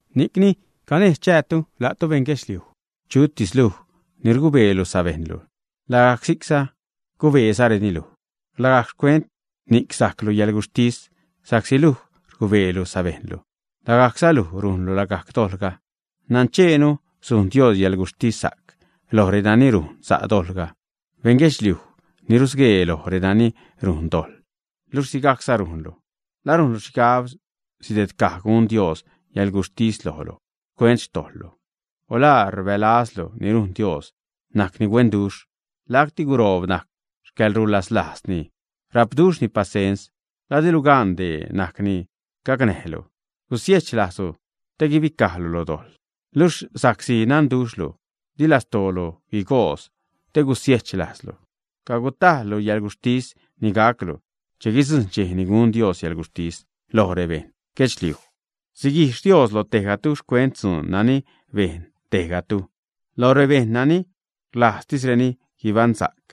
Ni'cni, ¿canejz chäätu, la'tu beṉguedxliuj? Chutis luj ni rgubeelu sabejṉlu, lagajc si'c cubeezareni luj, lagajc xcuent ni'c sajclu yäḻguxhtis, sa'csi luj rgubeelu sabejṉlu, lagajcza luj rujnlu lagajc dojḻga. Nancheenu sujn Dios yäḻguxhtissa'c loj renani rujn sa' dojḻga. Beṉ guedxliuj ni rgubee loj renani rujn dojḻ, luxh sigajcza rujnlu, ¿la rujnlu xhigab sidedcaj gun Dios yäḻguxhtis lojlu xcuent xtojḻlu, ä? O ¿la rbälazlu ni rujn Dios, najcni huenduxh, lacti guroob najc xcäḻrulaslajzni, rapduxhzani pasens? ¿La dilu gan dee najc ni gacnäjlu gusiechlajzlu te guibicajlu lo dojḻ, ä? Luxh sa'csi nadduxhlu, di lastoolu guigoodz te gusiechlajzlu, cagutajḻlu yäḻguxhtis ni gaclu che guidzujṉ dxej ni gun Dios yäḻguxhtis loj rebeṉ guedxliuj, siguijx Dios loj tejgatu xcuent dzuun nani bejn tejgatu. Loj rebejṉ nani rlajztisreni guibaṉsa'c,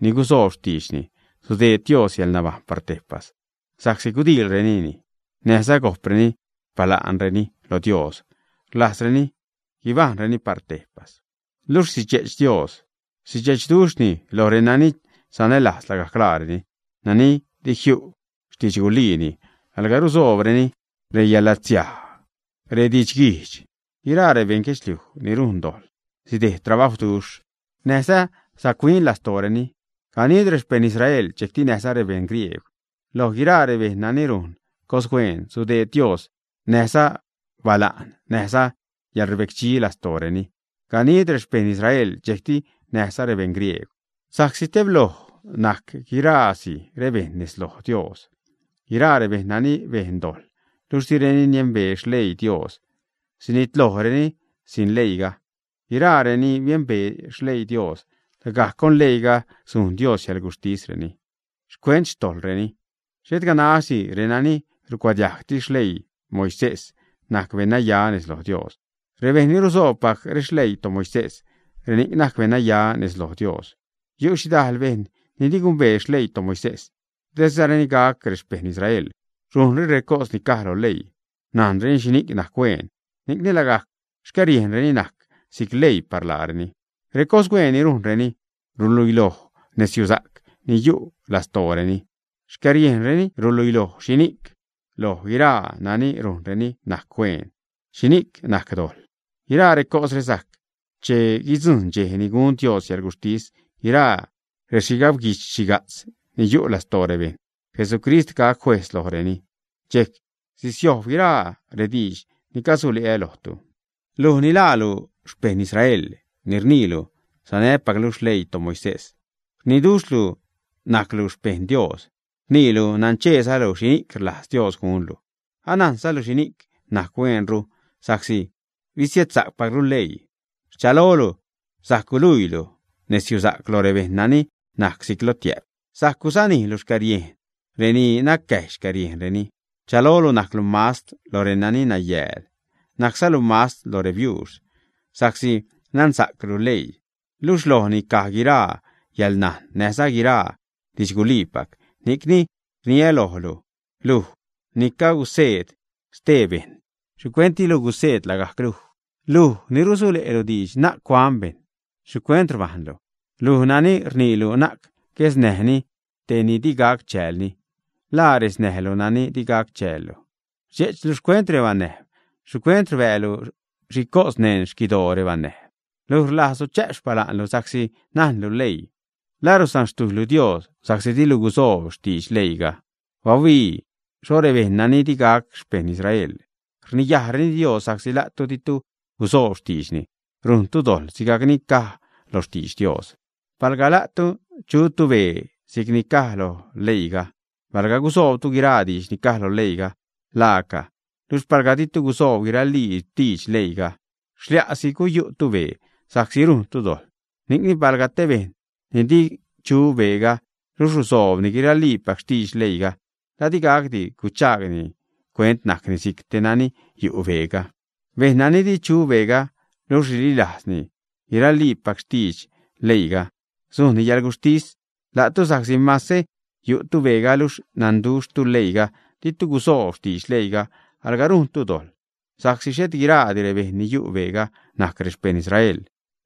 ni gusoob xtiidxni, sudeed Dios yäḻnabajṉ par tejpas sa'csi gudiilreni xhaniduj näjza go'preni xpala'nreni loj Dios, rlajzreni guibajṉreni loj Dios par tejpas. Luxh sidxe'ch Dios, sidxe'chduxhni loj renani sanälajz lagajc laareni, nani di jiu xtidxguliini, alga rusoobreni reyäḻlatsiaj, redidxguijdx. Guiraa rebeṉ guedxliuj ni rujn dojḻ sidejd trabajwduxh näjza sac-huin lastooreni; ganid rexpeṉ Israel, dxejcti näjza rebeṉ griegw. Loj guiraa rebejṉ nani rujn cos-hueen, sudeed Dios xhaniduj, näjza bala'ṉ, näjza yäḻrbecdxi lastooreni, ganid rexpeṉ Israel, dxejcti näjza rebeṉ griegw. Sa'csi tebloj najc guiraasi rebejṉ nez loj Dios. Guiraa rebejṉ nani bejn dojḻ, luxh direni niembee xleii Dios, sinitlojreni sin leiiga; guiraa reni biembee xleii Dios, lagajc con leiiga sujn Dios yäḻguxhtisreni xcuent xtojḻreni. Xhet ganaxdi renani rucuadiajgtis xleii Moisés najc beṉnaya nez loj Dios; rebejṉ ni rusoobpac rexleii toMoisés, reni'c najc beṉnaya loj Dios. Yu' xhidal bejṉ ni di gumbee xleii toMoisés, dizareni gac rexpeṉ Israel, rujnreni recos ni caj lo leii. Najnreni xhini'c najc cos sa'c. Ni'cni lagajc xcäriejnreni najc si'c leii par laareni. Recossa'c ni rujnreni ruluiloj nezyusa'c ni yu' lastooreni. Xcäriejnreni ruluiloj xhini'c loj guiraa nani rujnreni najc cos sa'c, xhini'c najc dojḻ. Guiraa recosre sajc che guidzujṉ dxej ni gun Dios yäḻguxhtis guiraa rexhigabxhiga'tz ni yu' lastoo rebejṉ. Jesucrist gac juejz lojreni, dxejc sisiojb guiraa rediidx ni cagusule'ä lojtu. Luj ni laalu xpeṉ Israel, ni rniilu sanäpaclu xleii toMoisés, rniduxhlu najclu xpeṉ Dios, rniilu nancheezalu xhini'c rlajz Dios gunlu, anajnzalu xhini'c najc hueenru sa'csi bisiedsa'cpaclu leii. Rchalolu sajc guluiilu nezyusa'c lo rebejṉ nani najc si'c lotiä'p, sajc guzanijlu xcäriejn reni nacäjy xcäriejnreni. Rchalolu najclu mastr lo renani nayääl, najczalu mastr lo rebiuux, sa'csi nansa'clu leii, luxh lojni caj guiraa yäḻnajn näjza guiraa didxguliipac. Ni'cni rniä lojlu, luj ni caguseed xtee bejṉ, ¿xhicuent dilu guseed lagajc luj? Luj ni rusule'lu diidx na'c cuan bejṉ, ¿xhicuent rbajnlu? Luj nani rniilu na'c guesnäjni te ni di gac chäälni, ¿la resnäjlu nani di gac chäällu, ä? Rdxe'chlu xcuent rebanäjb, ¿xhicuent rbäälu xhicos neṉ xquidoo rebanäjb, ä? Luj rlajzlu chä'p xpala'nlu sa'csi najnlu leii, ¿la rusanxtujylu Dios sa'csi dilu gusoob xtidx leiiga, ä? Bahuii xho rebejṉ nani di gac xpeṉ Israel rniyajreni Dios sa'csi la'tu ditu gusoob xtiidxni, rujntu dojḻ, sigajc ni caj lo xtidx Dios. Palga la'tu chutu bee si'cni caj lo leiiga, palga gusoobtu guiraa diidx ni caj lo leii, laaca. Luxh palga ditu gusoob guiraliipac xtidx leiiga, xlia'si guyu'tu bee, sa'csi rujntu dojḻ. Ni'cni palga te bejṉ ni di chu beega, luxh rusoobni guirliipac xtidx leiiga, ¿la di gacdi guchaagni cuent najcni si'c te nani yu' beega, ä? Bejṉ nani di chu beega, luxh rililajzni guiraliipac xtidx leiiga, sujnni yäḻguxhtis la'tu sa'csi mase yu'tu beega, luxh nanduxhtu leiiga, ditu gusoob xtidx leiiga, alga rujntu dojḻ. Sa'csi xhet guiraadi rebejṉ ni yu' beega najc rexpejṉ Israel,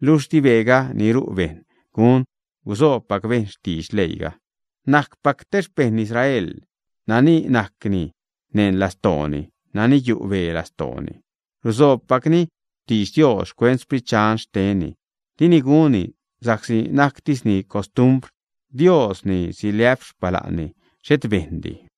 luxh di beega ni ru' bejṉ gun gusoobpac bejṉ xtidx leiiga. Najcpac te xpeṉ Israel nani najcni neṉ lastooni, nani yu' bee lastooni, rusoobpacni xtidx Dios xcuent Sprit xtenni, dini gunni sa'csi najctisni costumbr. Dios ni siliä'p xpala'nni, xhet bejṉdi.